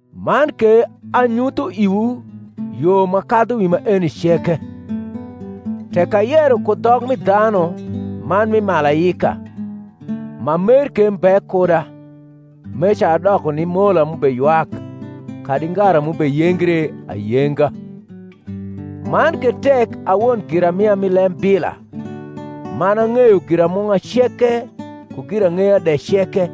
Man ke anyutho iwu yo ma kadhu wi maeni ceke. Tek ayero ku dhok mi dhanu man mi malaika, ma mer ke mbe kuda, meca adoko ni mola m’ubeywak, kadi ngara m’ubeyengre ayenga. Man ke tek a won giramia mi lembila, man ang’eyo giramung’a ceke ku girang’eya de ceke;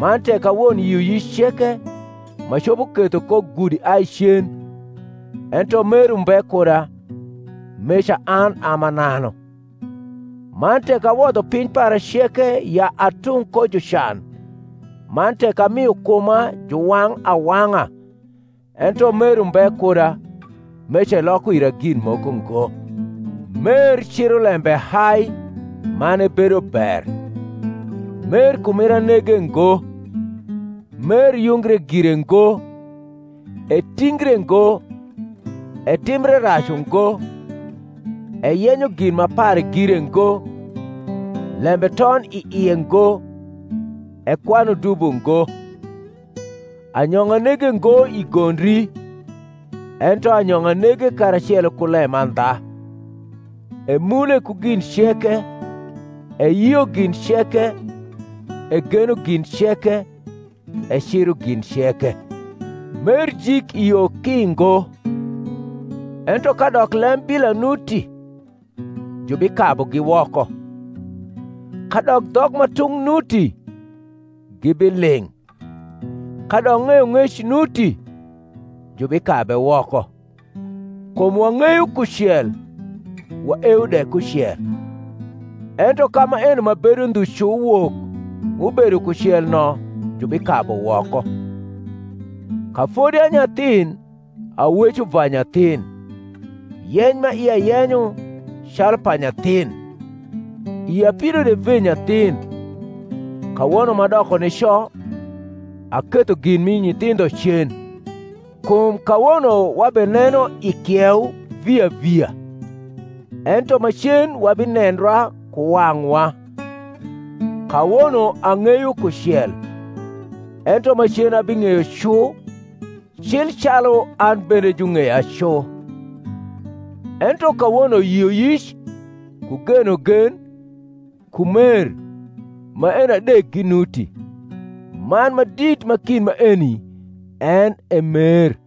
man tek a won yioyic ceke, m’acopo ketho ko gudi ai cen, ento mer umbe kuda, meca an a mananu. Man tek awodho piny para ceke ya atung ko jucan, man tek amio kuma juwang’ awang’a, ento mer umbe kuda, meca eloko ira gin moko ngo. Mer ciro lembe hai, man ebedo ber; mer kumira nege ngo; mer yungre gire ngo, etingre ngo, etimbre rac ungo, eyenyo gin ma pare gire ngo, lembe ton i ie ngo, ekwanu dubo ngo; anyong’a nege ngo i gondri, ento anyong’a nege karacelo ku lemandha; emule ku gin ceke, eyio gin ceke, egeno gin ceke, eciro gin ceke. Mer jik i yo ki ngo: ento kadok lembila nuti, jubikabugi woko; kadok dhok ma tung’ nuti, gibiling’; kadok ng’eyong’ec nuti, jubikabe woko. Kum wang’eyo kucel, waewo de kucel; ento ka maeno ma bedo ndhu cu wok m’ubedo kucel no jubikabu woko. Ka fodi a nyathin, aweco va nyathin, yeny ma ia yenyo calu pa nyathin, ia pido de ve nyathin; kawono m’adoko nico, aketho gin mi nyithindho cen. Kum kawono wabeneno i kieu via via; ento macen wabinendra ku wang’wa: kawono ang’eyo kucel; ento macen abing’eyo cu cil calu an bende jung’eya cu. Ento kawono yioyic, ku genogen, ku mer, maeni adek ginuti; man ma dit ma kind maeni en e mer.